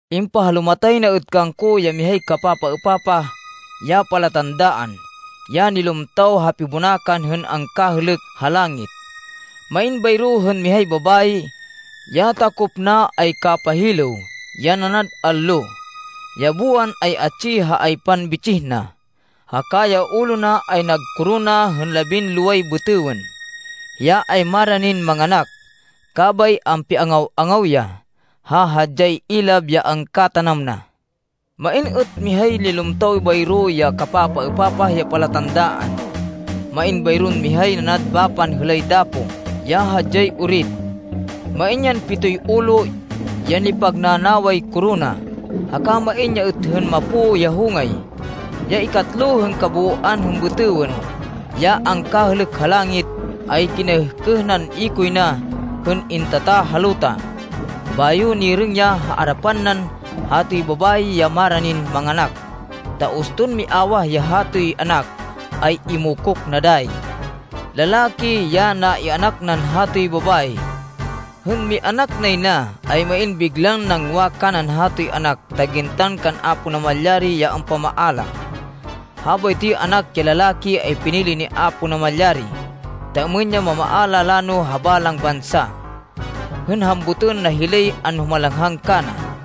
Impahalumatay na êt kangko ya mihay kapapaêpapah ya palatandaan, ya nilumtaw ha pibonakan hên angkahêlêk ha langit. Main bayro hên mihay babayi, ya takop na ay kapahilêw ya nanad allo. Ya buwan ay atsi ha aypan bitsih na, haka ya ulo na ay nagkorona hên labinloway bêtêwên. Hiya ay maranin manganak, kabay ampiangaw-angaw ya, ha hadyay ilab ya angkatanam na. Main êt mihay nilumtaw bayro ya kapapaêpapah ya palatandaan. Main bayron mihay nanad bapan hêlay dapo ya hadyay orit. Main yan pitoy ulo, ya nipag nanaway korona, haka main ya êt hên mapo ya hongay. Ya ikatlo hên kabooan hên bêtêwên ya angkahêlêk ha langit ay kinaêhkêh nan ikoy na hên intata ha luta. Bayo nirêng ya ha arapan nan hatoy babayi ya maranin manganak ta uston miawah ya hatoy anak, ay imokok na dayi. Lalaki ya na-ianak nan hatoy babayi. Hên mianak nay na, ay main biglan nangwa kanan hatoy anak ta gintan kan Apo Namalyari ya ampamaala. Habaytoy anak ya lalaki ay pinili ni Apo Namalyari, ta êmên ya mamaala lano ha balang bansa, hên hambutên na hilay anhumalanghang kana.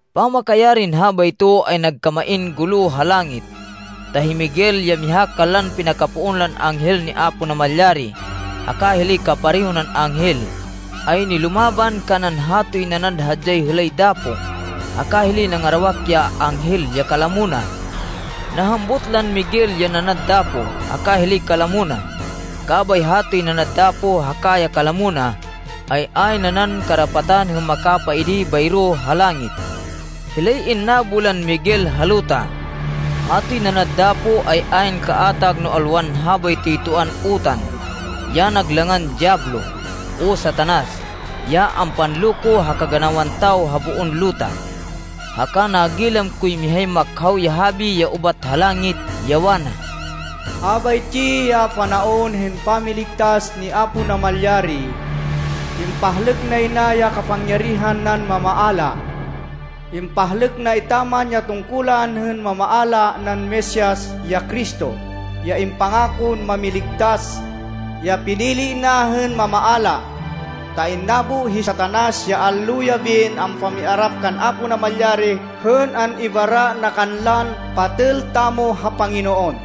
Pamakayarin habayto, ay nagkamain gulo ha langit, ta hi Miguel ya miha kanlan pinakapoon lan anghel ni Apo Namalyari haka hilay kapareho nan anghel, ay nilumaban kanan hatoy nanad hadyay hêlay dapo haka hilay nangarawak ya anghel ya kalamo na. Nahambut lan Miguel ya nanad dapo haka hilay kalamo na, kabay hatoy nanad dapo, haka ya kalamo na, ay ayn nanan karapatan hên makapaidi bayro ha langit. Hilay innabo lan Miguel ha luta. Hatoy nanad dapo ay ayn kaatag no alwan habaytoy toan utan, ya nag langan Diyablo, o Satanas, ya ampanloko ha kaganawan tawo ha boon luta. Haka nagilam koy mihay makhaw ya habi ya ubat ha langit, ya wana, “Habaytsi ya panaon hên pamiligtas ni Apo Namalyari. Impahlêk nay na ya kapangyarihan nan mamaala. Impahlêk na etaman ya tungkulan hên mamaala nan Mesias, ya Cristo, ya impangakon Mámiligtas, ya pinili na hên mamaala. Ta innabo hi Satanas, ya allo-yabin ampamiarap kan Apo Namalyari hên an-ibara na kanlan patêl tamo ha Panginoon.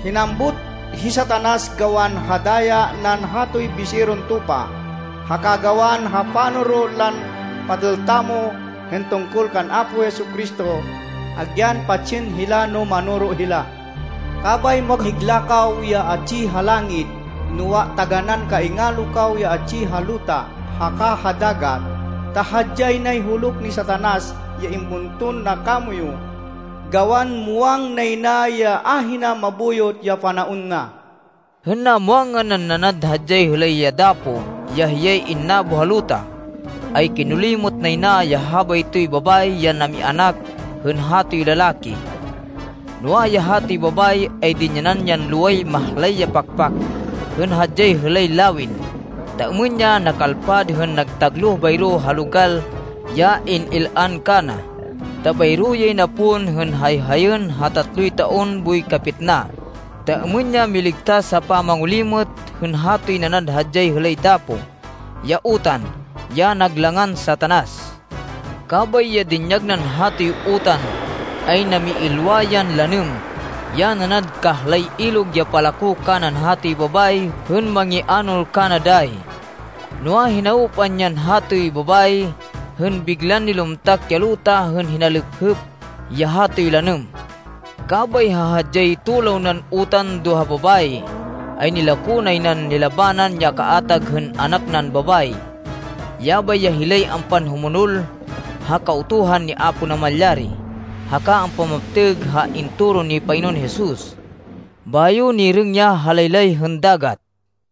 Hinambut hi Satanas gawan ha daya nan hatoy Biseron Tupa, haka gawan ha panoro lan patêl tamo hên tungkol kan Apo Jesu-Cristo, hên patsên hila man. Kabay maghigla kaw ya atsi ha langit, noa, taganán kaingalo kaw ya atsi ha luta haka ha dagat, ta hadyay nay huluk ni Satanas ya ibunton na kamoyu, gawan muwang nay na ya ahina mabuyot ya panaon na.” Hên namwangan nan nanad hadyay hêlay ya dapo ya hiyay innabo ha luta, ay kinolimêt nay na ya habaytoy babayi ya namianak hên hatoy lalaki. Noa, ya hatoy babayi ay dinyanan yan loway mahlay ya pakpak hên hadyay hêlay lawin, ta êmên ya nakalpad hên nagtagloh bayro ha logal ya in-il-an kana, ta bayro yay na pon hên hayhayên ha tatloy taon boy kapitna, ta êmên ya miligtas ha pamangolimêt hên hatoy nanad hadyay hêlay dapo, ya utan, ya nag langan Satanas. Kabay ya dinyag nan hatoy utan, ay namiilwa yan lanêm ya nanad kahlay ilog ya palako kanan hatoy babayi hên mangianol kana dayi. Noa, hinawpan yan hatoy babayi hên biglan nilumtak ya luta hên hinalêphêp ya hatoy lanêm. Kabay ha hadyay tulaw nan utan do ha babayi, ay nilako nay nan nilabanan ya kaatag hên anak nan babayi. Yabay ya hilay ampanhumonol ha Kautuhan ni Apo Namalyari, haka ampamaptêg ha intoro ni Panginoon Jesus. Bayo nirêng ya ha laylay hên dagat.